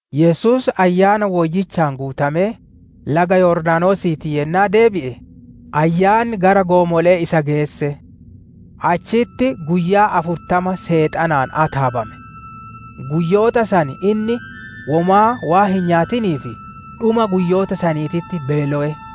Yesuus Ayyaana Woyyichaan guutamee laga Yordaanosiitii yennaa deebi'e, Ayyaanni gara goomole'ee isa geesse. Achitti guyyaa afurtama Seexanaan ataabame. Guyyoota san inni womaa hin nyaanne; tanaaf dhuma guyyoota saniititti inni beelowe.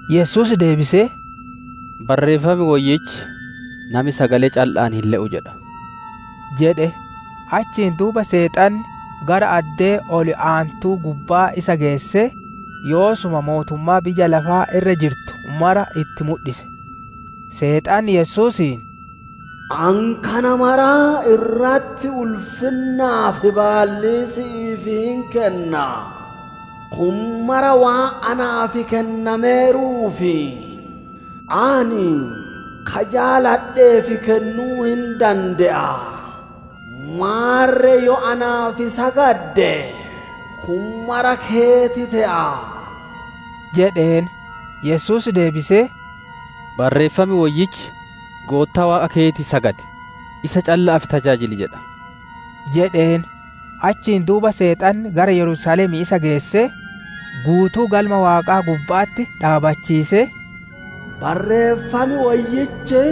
Yesuus deebisee, «Barreeffam woyyichi, ‹Nami sagalee calla'aan hin le'u› jedha» jedhe. Achiin duuba Seexanni gara addee ol aantuu gubbaa isa geessee, yoosuma mootummaa biyya lafaa irra jirtu mara itti mudhise. Seexanni Yesuusiin, «Ani kana maraa irratti ulfinnaa fi baallii si'iif hin kenna. Kun maraa waan naaf kennameeruuf, ani ka jaaladheef kennuu hin dande'a. Maarre yoo naaf sagadde, kun maraa keeti te'a» jedheen. Yesuus deebisee, «Barreeffam Woyyichi, ‹Goottaa Waaqa keetiif sagadi; isa calla'aafille tajaajili!› jedha» jedheen. Achiin duuba Seexanni gara Yerusaalemii isa geessee, guutuu Galma Waaqaa gubba'atti dhaabbachiisee, «Barreeffam Woyyichi,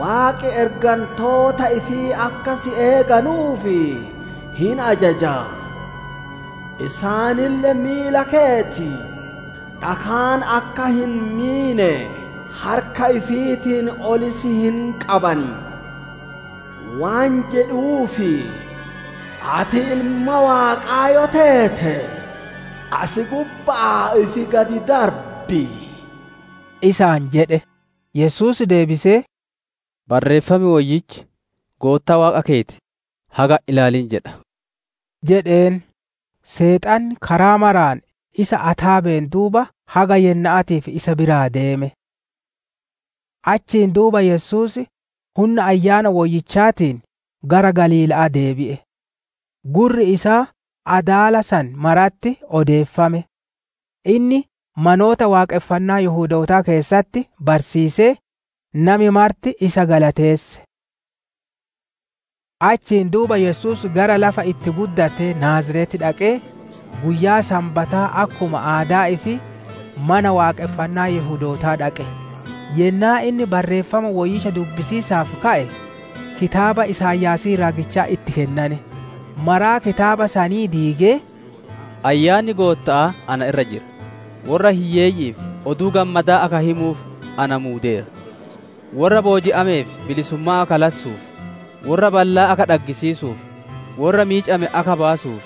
‹Waaqi ergantoota ifii akka si eeganuuf hin ajaja. Isaanille miila keeti dhakaan akka hin miine harka ifiitiin ol si hin qaban› waan jedhuuf, ati Ilma Waaqaa yoo teete, asi gubba'aa ifi gad darbi» isaan jedhe. Yesuus deebisee, «Barreeffam Woyyichi, ‹Goottaa Waaqa keeti haga hin ilaalin› jedha» jedheen. Seexanni karaa maraan isa ataabeen duuba haga yenna'aatiif isa biraa deeme. Achiin duuba Yesuus hunna Ayyaana Woyyichaatiin gara Galiila'aa deebi'e. Gurri isaa adaala san maratti odeeffame. Inni manoota waaqonfannaa Yihudootaa keessatti barsiisee, nami marti isa galateesse. Achiin duuba Yesuus gara lafa itti guddatee, Naaziret dhaqee, guyyaa Sanbataa akkuma aadaa ifii Mana Waaqonfannaa Yihudootaa dhaqe. Yennaa inni Barreeffama Woyyicha dubbisiisaaf ka'e, kitaaba Isaayaasii raagichaa itti kennane. Maraa kitaaba sanii diigee, «Ayyaanni Gootta'aa ana irra jira, worra hiyyeeyyi'iif Oduu Gammadaa akka himuuf na muudeera. Worra booji'ameef bilisummaa akka lassuuf, worra ballaa akka dhaggisiisuuf, worra miicame akka baasuuf,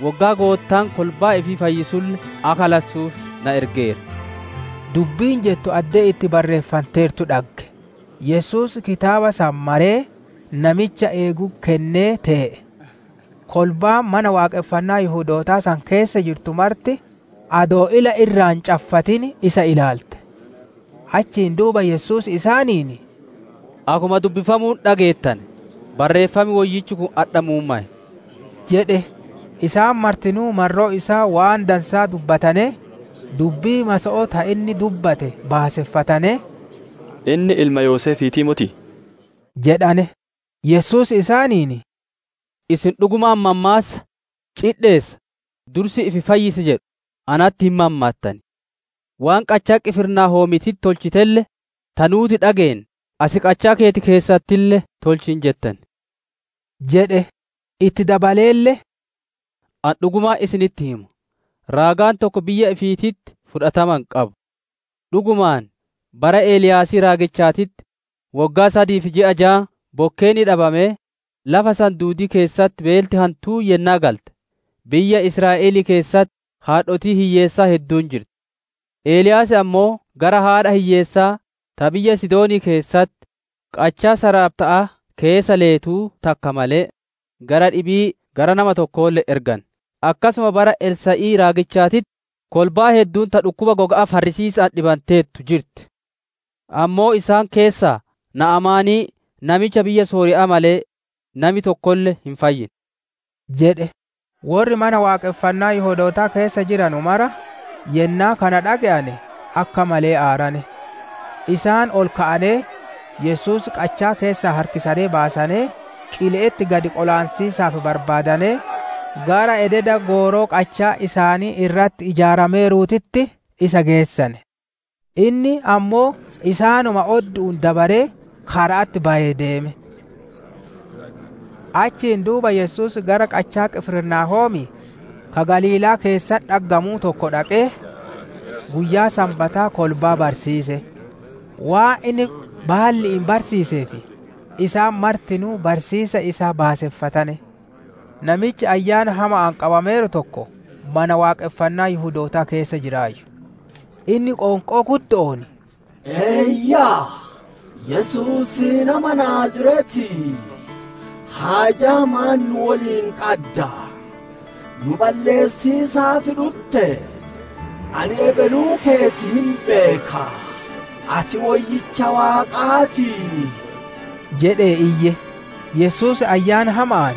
woggaa Goottaan kolbaa ifii fayyisulle akka lassuuf na ergeera» dubbiin jettu addee itti barreeffanteertu dhagge. Yesuus kitaaba san maree, namicha eegutti kennee tee'e. Kolbaan Mana Waaqonfannaa Yihudootaa san keessa jirtu marti adoo ila irraa hin caffatin isa ilaalte. Achiin duuba Yesuus isaaniin, «Akkuma dubbifamuun dhageettane, Barreeffam Woyyichi kun adha muummowe» jedhe. Isaan martinuu marroo isaa waan dansaa dubbatanee, dubbii maso'oo ta inni dubbate baaseffatanee, «Inni ilma Yoseefiitii motii?» jedhane. Yesuus isaaniin, «Isin dhugumaan mammaassa, ‹Cidheessa, dursii ifi fayyis!› jedhu natti hin mammaattan. Waan qachaa Qifirnaahoomiititti tolchitelle, ta nuuti dhageenne as qachaa keeti keessattille tolchi hin jettan» jedhe. Itti dabaleelle, «Ani dhugumaan isinitti hima, raagaan tokko biyya ifiititti fudhatama hin qabu. Dhugumaan, bara Eliyaasii raagichaatitti woggaa sadii fi ji'a jaan bokkeenni dhabamee, lafa san duudii keessatti beelti hantuun yennaa galte, biyya Israa'elii keessatti haadhotiin hiyyeessaa hedduun jirti. Eliyaas ammoo gara haadha hiyyeessaa ta biyya Sidoonii keessatti qachaa Saraaphta'aa keessa leetuu takka malee, gara dhibii gara nama tokkoolle hin erganne. Akkasuma bara Elsaa'ii raagichaatitti kolbaan hedduun ta dhukkuba goga'aa farrisiisa'aan dhibanteertu jirti; ammoo, isaan keessaa Na'amaanii namicha biyya Sooriya'aa malee, nami tokkolle hin fayyine» jedhe. Worri mana waaqonfannaa Yihudootaa keessa jiranu martinuu yennaa kana dhage'ane, akka malee aarane. Isaan ol ka'anee, Yesuus qachaa keessaa harkisanee baasanee qile'etti gad qolaansiisaaf barbaadanee, gara ededa gooroo qachaan isaanii irratti ijaarameeruutitti isa geessane. Inni ammoo isaanuma oddu'uun dabaree kara'atti bayee deeme. Achiin duuba Yesuus gara qachaa Qifirnaahoomii, ka Galiilaa keessatti dhaggamuu tokko dhaqee, guyyaa Sanbataa kolbaa barsiise. Waan inni baalli'iin barsiiseef, isaan martinuu barsiisiisa isaa baaseffatane. Namichi Ayyaana hama'aan qabameeru tokko mana waaqonfannaa Yihudoota keessa jiraayyu. Inni qoonqoo guddo'oon, «Eeyyaa! Yesuusii nama Naaziretii, haajaa maan nu woliin qadda? Nu balleessiisaaf dhuttee? Ani ebeluu keeti hin beeka! Ati Woyyicha Waaqaa ti» jedhee iyye. Yesuus ayyaana hama'aan,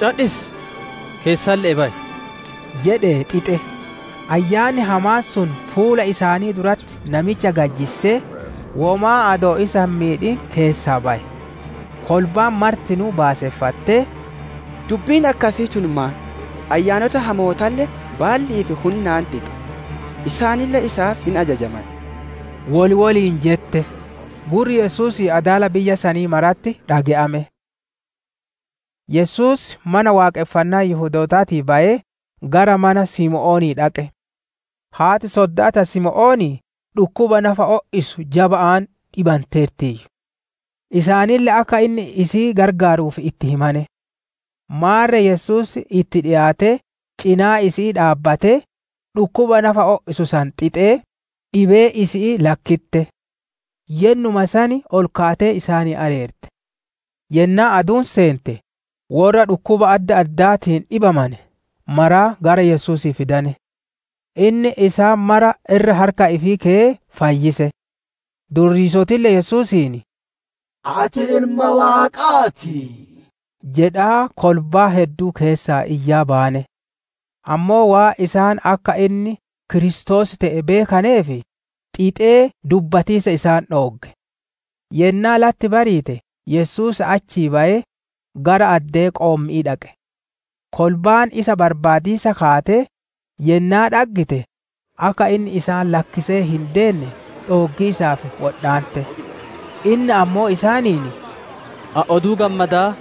«Cadhisi! Keessalle'ee bayi!» jedhee xixe. Ayyaanni hamaan sun fuula isaanii duratti namicha gad jissee, womaa adoo isa hin miidhin keessaa baye. Kolbaan martinuu baaseffatee, «Dubbiin akkasii tun maan? Ayyaanota hamootalle baalli'ii fi hunnaan xixa; isaanille isaaf hin ajajaman» wol woliin jette. Gurri Yesuusii adaala biyya sanii maratti dhage'ame. Yesuus Mana Waaqonfannaa Yihudootaatii bayee gara mana Simoonii dhaqe. Haati sodda'aa ta Simoonii dhukkuba nafa o'isu jaba'aan dhibanteertiiyyu; isaanille akka inni isii gargaaruuf itti himane. Maarre Yesuus itti dhikaatee cinaa isi'ii dhaabbatee, dhukkuba nafa o'isu san xixee, dhibeen isii lakkitte. Yennuma san ol kaatee isaanii areerte. Yennaa aduun seente, worra dhukkuba adda addaatiin dhibamane maraa gara Yesuusii fidane. Inni isaan mara irra harka ifii keyee fayyise. Durriisotille Yesuusiin, «Ati Ilma Waaqaa ti» jedhaa kolbaa hedduu keessaa iyyaa bayane. Ammoo waan isaan akka inni Kiristoos te'e beekaneef, xixee dubbatiisa isaan dhoogge. Yennaa latti bariite Yesuus achii bayee, gara addee qoommi'ii dhaqe. Kolbaan isa barbaadiisa kaatee, yennaa dhaggite, akka inni isaan lakkisee hin deemne dhooggiisaaf wodhaante. Inni ammoo isaaniin, «Ani Oduu Gammadaa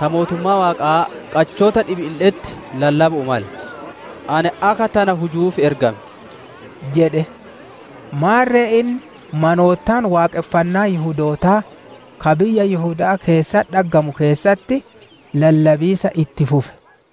ta mootummaa Waaqaa qachoota dhibiille'etti lallabu'uu male; ani akka tana hujuuf ergame» jedhe. Maarre inni manoota waaqonfannaa Yihudootaa ka biyya Yihuda'aa keessatti dhaggamuu keessatti lallabiisa itti fufe.